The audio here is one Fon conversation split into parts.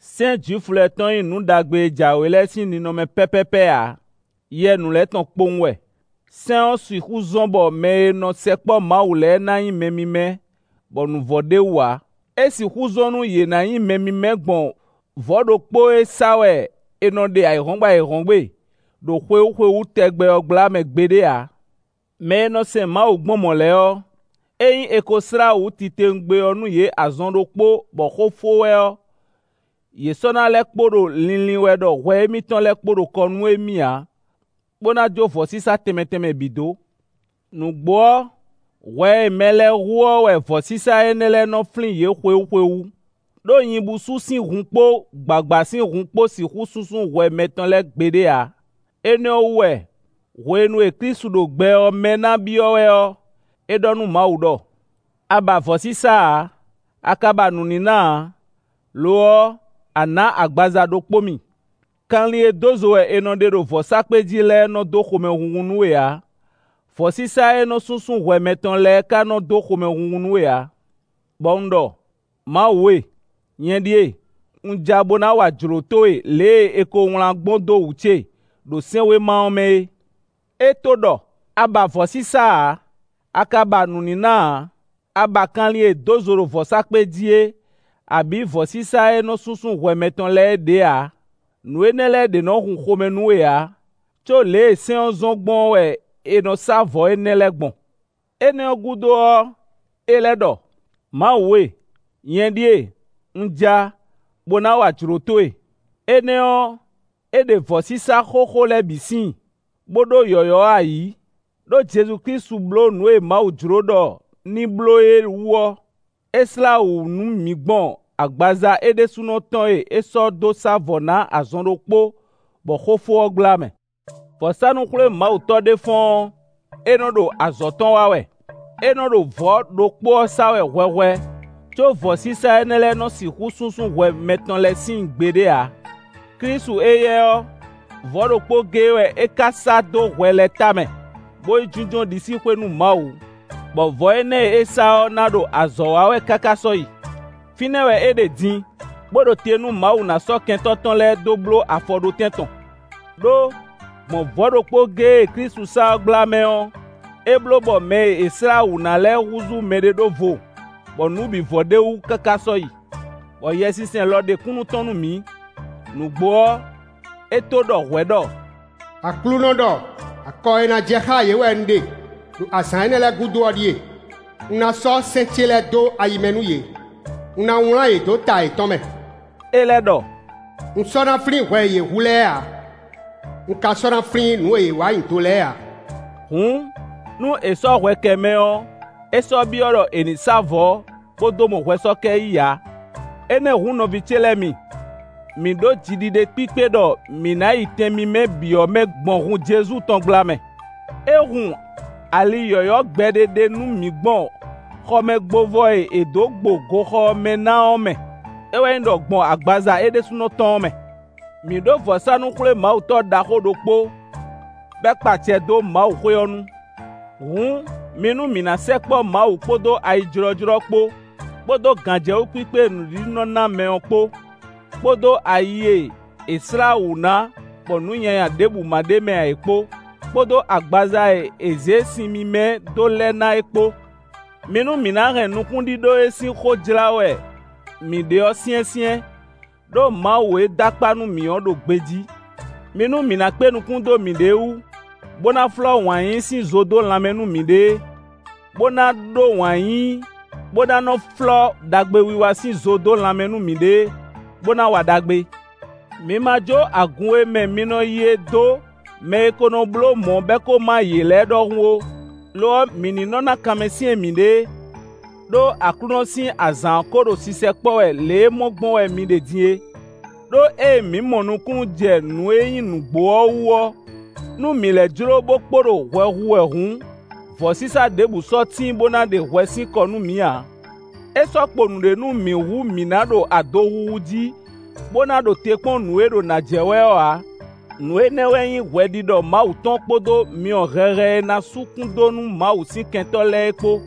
Sɛ́n Jwifu lɛ́ɛ tɔn nyí nǔ ɖagbe e jǎwe lɛ́ɛ sín ninɔmɛ pɛ́pɛ́pɛ́ ǎ; yɛ nǔ lɛ́ɛ tɔn kpowun wɛ. Sɛ́n ɔ́ sixú zɔ́n bɔ mɛ e nɔ sɛkpɔ́ Mawu lɛ́ɛ ná nyí mɛ mímɛ́ bɔ nǔ vɔ ɖ'é wú ǎ; é sixú zɔ́n nú yě ná nyí mɛ mímɛ́ gbɔn vɔ̌ ɖokpó e sá wɛ è nɔ ɖe ayǐhɔ́ngbe ayǐhɔ́ngbe ɖo xwewú xwewú tɛgbɛ ɔ́ gbla mɛ gbeɖé ǎ. Mɛ e nɔ sɛn Mawu gbɔn mɔ̌ lɛ́ɛ ɔ́, ényí è ko slá wǔ titewungbe ɔ́ nú yě azɔn ɖokpó bɔ xó fó wɛ ɔ́, yě sɔ́ ná lɛ́ kpo ɖo linlin wɛ ɖɔ hwɛ émítɔn lɛ́ɛ kpo ɖo kɔ nú émí ǎ, bó ná jó vɔ̌sísá tɛnmɛ tɛnmɛ bǐ dó. Nǔgbó ɔ́, hwɛ e mɛ lɛ́ɛ hu ɔ́ wɛ vɔ̌sísá énɛ́ lɛ́ɛ nɔ flín yě xwewú xwewú. Đó nyibúsú sín hun kpó gbǎgbá sín hun kpó sixú súnsún hwɛ mɛtɔn lɛ́ɛ gbeɖé ǎ. Énɛ́ ɔ́ wú wɛ hwenu e Klísu ɖo gbɛ ɔ́ mɛ ná byɔ́ wɛ ɔ́, é ɖɔ nú Mawu ɖɔ: “A ba vɔ̌sísá ǎ, a ka ba nǔníná ǎ; lo ɔ́, a nǎ agbaza ɖokpó mì. Kanlin e dó zo wɛ è nɔ ɖe ɖo vɔ̌sákpe jí lɛ́ɛ nɔ dó xomɛhunhun nú we ǎ; vɔ̌sísá e nɔ súnsún hwɛ mɛtɔn lɛ́ɛ ka nɔ dó xomɛhunhun nú we ǎ. Bɔ un ɖɔ: ‘Mawu e, nyɛ ɖíe, un ja bó ná wa jlǒ towe lě e è ko wlán gbɔn dó wǔ ce, ɖo sɛ́nwéma ɔ́ mɛ é.’” É tó ɖɔ: “A ba vɔ̌sísá ǎ; a ka ba nǔníná ǎ; a ba kanlin e è dǒ zo ɖo vɔ̌sákpe jí é abǐ vɔ̌sísá e nɔ súnsún hwɛ mɛtɔn lɛ́ɛ é ɖě ǎ; nǔ énɛ́ lɛ́ɛ ɖě nɔ hun xomɛ nú we ǎ; có lě e sɛ́n ɔ́ zɔ́n gbɔn ɔ́ wɛ è nɔ sá vɔ̌ énɛ́ lɛ́ɛ gbɔn.” Énɛ́ ɔ́ gúdo ɔ́, é lɛ́ ɖɔ: “Mawu e, nyɛ ɖíe, un ja, bó ná wa jlǒ towe.” Énɛ́ ɔ́, é ɖe vɔ̌sísá xóxó lɛ́ɛ bǐ síin, bó ɖó yɔ̌yɔ́ ɔ́ ayǐ. Đó Jezu Klísu bló nǔ e Mawu jló ɖɔ ní bló é wú ɔ́, è slá wǔ nú mǐ gbɔn agbaza é ɖésúnɔ tɔn e é sɔ́ dó sá vɔ̌ ná azɔn ɖokpó bɔ xó fó ɔ́ gbla mɛ. Vɔ̌sánú-xwlémawutɔ́ ɖé fɔ́n ɔ́, é nɔ ɖo azɔ̌ tɔn wa wɛ; é nɔ ɖo vɔ̌ ɖokpó ɔ́ sá wɛ hwɛhwɛ, có vɔ̌sísá énɛ́ lɛ́ɛ nɔ sixú súnsún hwɛ mɛtɔn lɛ́ɛ síin gbeɖé ǎ. Klísu éyɛ́ ɔ́, vɔ̌ ɖokpó géé wɛ é ka sá dó hwɛ lɛ́ɛ tamɛ, bó yi jínjɔ́n ɖisíxwé nú Mawu, bɔ vɔ̌ énɛ́ e é sá ɔ́ ná ɖo azɔ̌ wa wɛ káká sɔ́yi. Fínɛ́ wɛ é ɖe din, bó ɖo te nú Mawu ná sɔ́ kɛntɔ́ tɔn lɛ́ɛ dó bló afɔɖótɛn tɔn. Đó, gbɔn vɔ̌ ɖokpó géé e Klísu sá ɔ́ gblá mɛ ɔ́, é bló bɔ mɛ e è slá wǔ ná lɛ́ɛ húzú mɛɖeɖóvo, bɔ nǔ bǐ vɔ ɖ'é wú káká sɔ́yi. Bɔ Yɛsinsɛn lɔ ɖe kúnnu tɔn nú mǐ. Nǔgbó ɔ́, é to ɖɔ hwɛ̌ ɖɔ: “Aklúnɔ ɖɔ: ‘Akɔ e ná jɛ xá yě wɛ un ɖe ɖo azǎn énɛ́ lɛ́ɛ gúdo ɔ́ ɖíe: un ná sɔ́ sɛ́n ce lɛ́ɛ dó ayi mɛ nú yě; un ná wlán yě dó ta yětɔn mɛ.’” É lɛ́ ɖɔ: “Un sɔ́ ná flín hwɛ e yě hu lɛ́ɛ ǎ; un ka sɔ́ ná flín nǔ e yě wa nyi do lɛ́ɛ ǎ.” Hǔn, nú è sɔ́ hwɛ kɛ mɛ ɔ́, é sɔ́ byɔ́ ɖɔ è nǐ sá vɔ̌, bó dó mɔ hwɛsɔ́kɛ yí ǎ. Énɛ́ hǔn nɔví ce lɛ́ɛ mi, mǐ ɖó jiɖiɖe kpíkpé ɖɔ mǐ ná yi Tɛn mímɛ́ bǐ ɔ́ mɛ gbɔn hun Jezu tɔn gbla mɛ. É hun ali yɔ̌yɔ́ gbɛɖe ɖé nú mǐ gbɔn xɔmɛgbovɔ e è dǒ gbo goxɔ ɔ́ mɛ ná ɔ́ mɛ; é wɛ nyí ɖɔ gbɔn agbaza é ɖésúnɔ tɔn ɔ́ mɛ. Mǐ ɖó vɔ̌sánú-xwlémawutɔ́ ɖaxó ɖokpó bɔ é kpa acɛ dó Mawu xwé ɔ́ nu. Hǔn, mi nú mǐ ná sɛkpɔ́ Mawu kpódó ayijlɔ́jlɔ́ kpó, kpódó gǎnjɛwú kpíkpé e nǔɖiɖi nɔ ná mɛ ɔ́ kpó, kpódó ayi e è slá wǔ ná bɔ nǔ nyanya ɖěbǔ ma ɖ'é mɛ ǎ é kpó, kpódó agbaza e è zě sin mímɛ́ dó lɛ ná é kpó. Mi nú mǐ ná hɛn nukúnɖíɖó e sín xó jlá wɛ mǐ ɖe ɔ́ syɛ́nsyɛ́n, ɖó Mawu e dó akpá nú mǐ ɔ́ ɖo gbejí. Mi nú mǐ ná kpé nukún dó mǐɖée wú, bó ná flɔ́ wǎn yíyí sín zo dó lanmɛ nú mǐɖée, bó ná ɖó wǎn yíyí, bó ná nɔ flɔ́ ɖagbewiwa sín zo dó lanmɛ nú mǐɖée, bó ná wa ɖagbe. Mǐ ma jó agun e mɛ mǐ nɔ yi é dó, mɛ e ko nɔ bló mɔ̌, bɔ é ko má yě lɛ́ɛ ɖɔhun ó. Lo ɔ́, mǐ ní nɔ ná kanmɛsyɛ́n mǐɖée, ɖó Aklúnɔ sín azǎn ɔ́ ko ɖo sisɛkpɔ́ wɛ lě e mɔ gbɔn wɛ mi ɖe din é. Đó ée mǐ mɔ nukúnnú jɛ nǔ e nyí nǔgbó ɔ́ wú ɔ́, nú mǐ lɛ́ jló bó kpo ɖo hwɛ hu wɛ hǔn, vɔ̌sísá ɖěbǔ sɔ́ tíin bó ná ɖe hwɛ sín kɔ nú mǐ ǎ. É sɔ́ kpo nǔɖé nú mǐ hú mǐ ná ɖo adohu adohu jí, bó ná ɖo te kpɔ́n nǔ e ɖo nǎ jɛ wɛ ɔ́ ǎ. Nǔ énɛ́ wɛ nyí hwɛɖiɖɔ Mawu tɔn kpódó myɔ hɛhɛ e ná sú kún dó nú Mawu sín kɛntɔ́ lɛ́ɛ é kpó.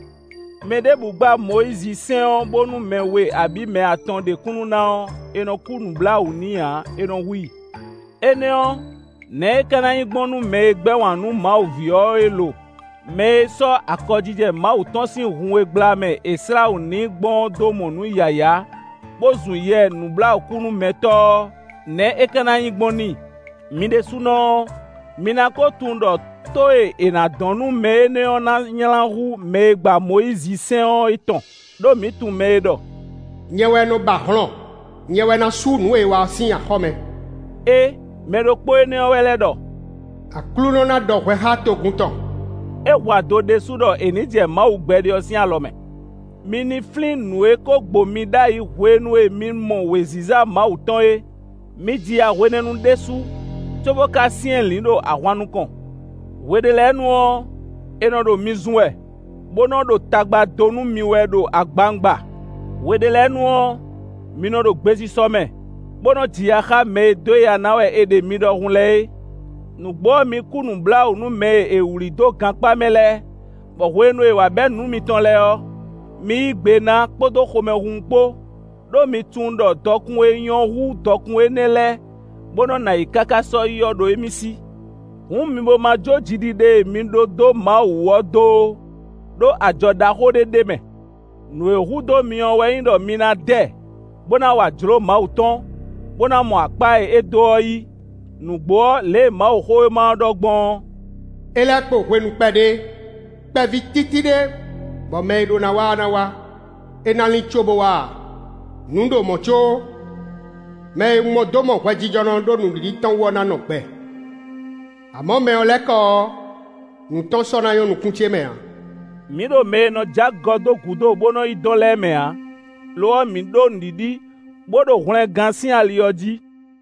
Mɛɖěbǔ gba Mɔyízisɛ́n ɔ́ bónú mɛ we abǐ mɛ atɔn ɖe kúnnu ná ɔ́, è nɔ kú nǔbláwǔ n'i ǎ, è nɔ hu i. Énɛ́ ɔ́, nɛ̌ é ka ná nyí gbɔn nú mɛ e gbɛ́ wǎn nú Mawu ví ɔ́ é lo? Mɛ e sɔ́ akɔjijɛ Mawu tɔn sín hun e gbla mɛ è slá wǔ n'i gbɔn ɔ́ dó mɔ nǔ yǎyá, bó zun Yɛ nǔbláwǔkúnúmɛtɔ́ ɔ́, nɛ̌ é ka ná nyí gbɔn n'i? Mi ɖésúnɔ ɔ́, mi ná ko tunwun ɖɔ tó e è nǎ dɔn nú mɛ énɛ́ ɔ́ ná nylá hú mɛ e gba Mɔyízisɛ́n ɔ́ é tɔn. Đó mǐ tunwun mɛ e ɖɔ: “Nyɛ wɛ nɔ ba hlɔn; nyɛ wɛ ná sú nǔ e è wa ɔ́ sín axɔ́ mɛ” é; mɛ ɖokpó énɛ́ ɔ́ wɛ lɛ́ ɖɔ: “Aklúnɔ ná ɖɔ hwɛ xá togun tɔn.” É hu ado ɖésú ɖɔ è nǐ jɛ Mawu gbɛɖe ɔ́ sín alɔ mɛ. Mi ní flín nǔ e ko gbo mi ɖ'ayǐ hwenu e mi mɔ wěziza Mawu tɔn é; mi ji ya hwenɛ́nu ɖésú, có bó ka syɛ́nlǐn ɖo ahwan nukɔn. Hwe ɖé lɛ́ɛ nu ɔ́, è nɔ ɖo mi zun wɛ, bó nɔ ɖo tagba dó nú mi wɛ ɖo agbawungba. Hwe ɖé lɛ́ɛ nu ɔ́, mi nɔ ɖo gbesisɔ mɛ, bó nɔ ji ya xá mɛ e dó ya ná wɛ è ɖe mi ɖɔhun lɛ́ɛ é. Nǔgbó ɔ́, mi kú nǔbláwǔ nú mɛ e è wlǐ dó gankpá mɛ lɛ́ɛ, bɔ hwenu e è wǎ bɛ́ nǔ mitɔn lɛ́ɛ ɔ́, mi yí gbe ná kpódó xomɛhunhun kpó, ɖó mi tunwun ɖɔ dɔkun e nyɔ́ hú dɔkun énɛ́ lɛ́ɛ, bó nɔ́ nɔ ayǐ káká sɔ́yi ɔ́ ɖo émí sí. Hǔn mi bo ma jó jiɖiɖe e mi ɖó dó Mawu wú ɔ́ dó ó; ɖó ajɔ ɖaxó ɖé ɖ'é mɛ. Nǔ e hu dó mi ɔ́ wɛ nyí ɖɔ mi ná dɛ, bó ná wa jlǒ Mawu tɔn, bó ná mɔ akpá e é dó ɔ́ yí. Nǔgbó ɔ́, lě e Mawuxówéma ɖɔ gbɔn ɔ́: “É lɛ́ kpo hwenu kpɛɖé, kpɛví títí ɖé bɔ mɛ e ɖó ná wá ɔ́ ná wá; é ná lín có bo wá ǎ. Nǔ ɖo mɔ̌ có, mɛ e un mɔ dó mɔ hwɛjijɔnɔ ɖó nǔɖiɖi tɔn wú ɔ́ ná nɔ gbɛ. Amɔ̌ mɛ ɔ́ lɛ́ kɔ ɔ́, nǔ tɔn sɔ́ ná nyɔ́ nukún ce mɛ ǎ.” Mǐ ɖo mɛ e nɔ jó agɔ dó gúdo, bó nɔ yi dɔn lɛ́ɛ mɛ ǎ; lo ɔ́, mǐ ɖó nǔɖiɖi, bó ɖo hwlɛngán sín ali ɔ́ jí.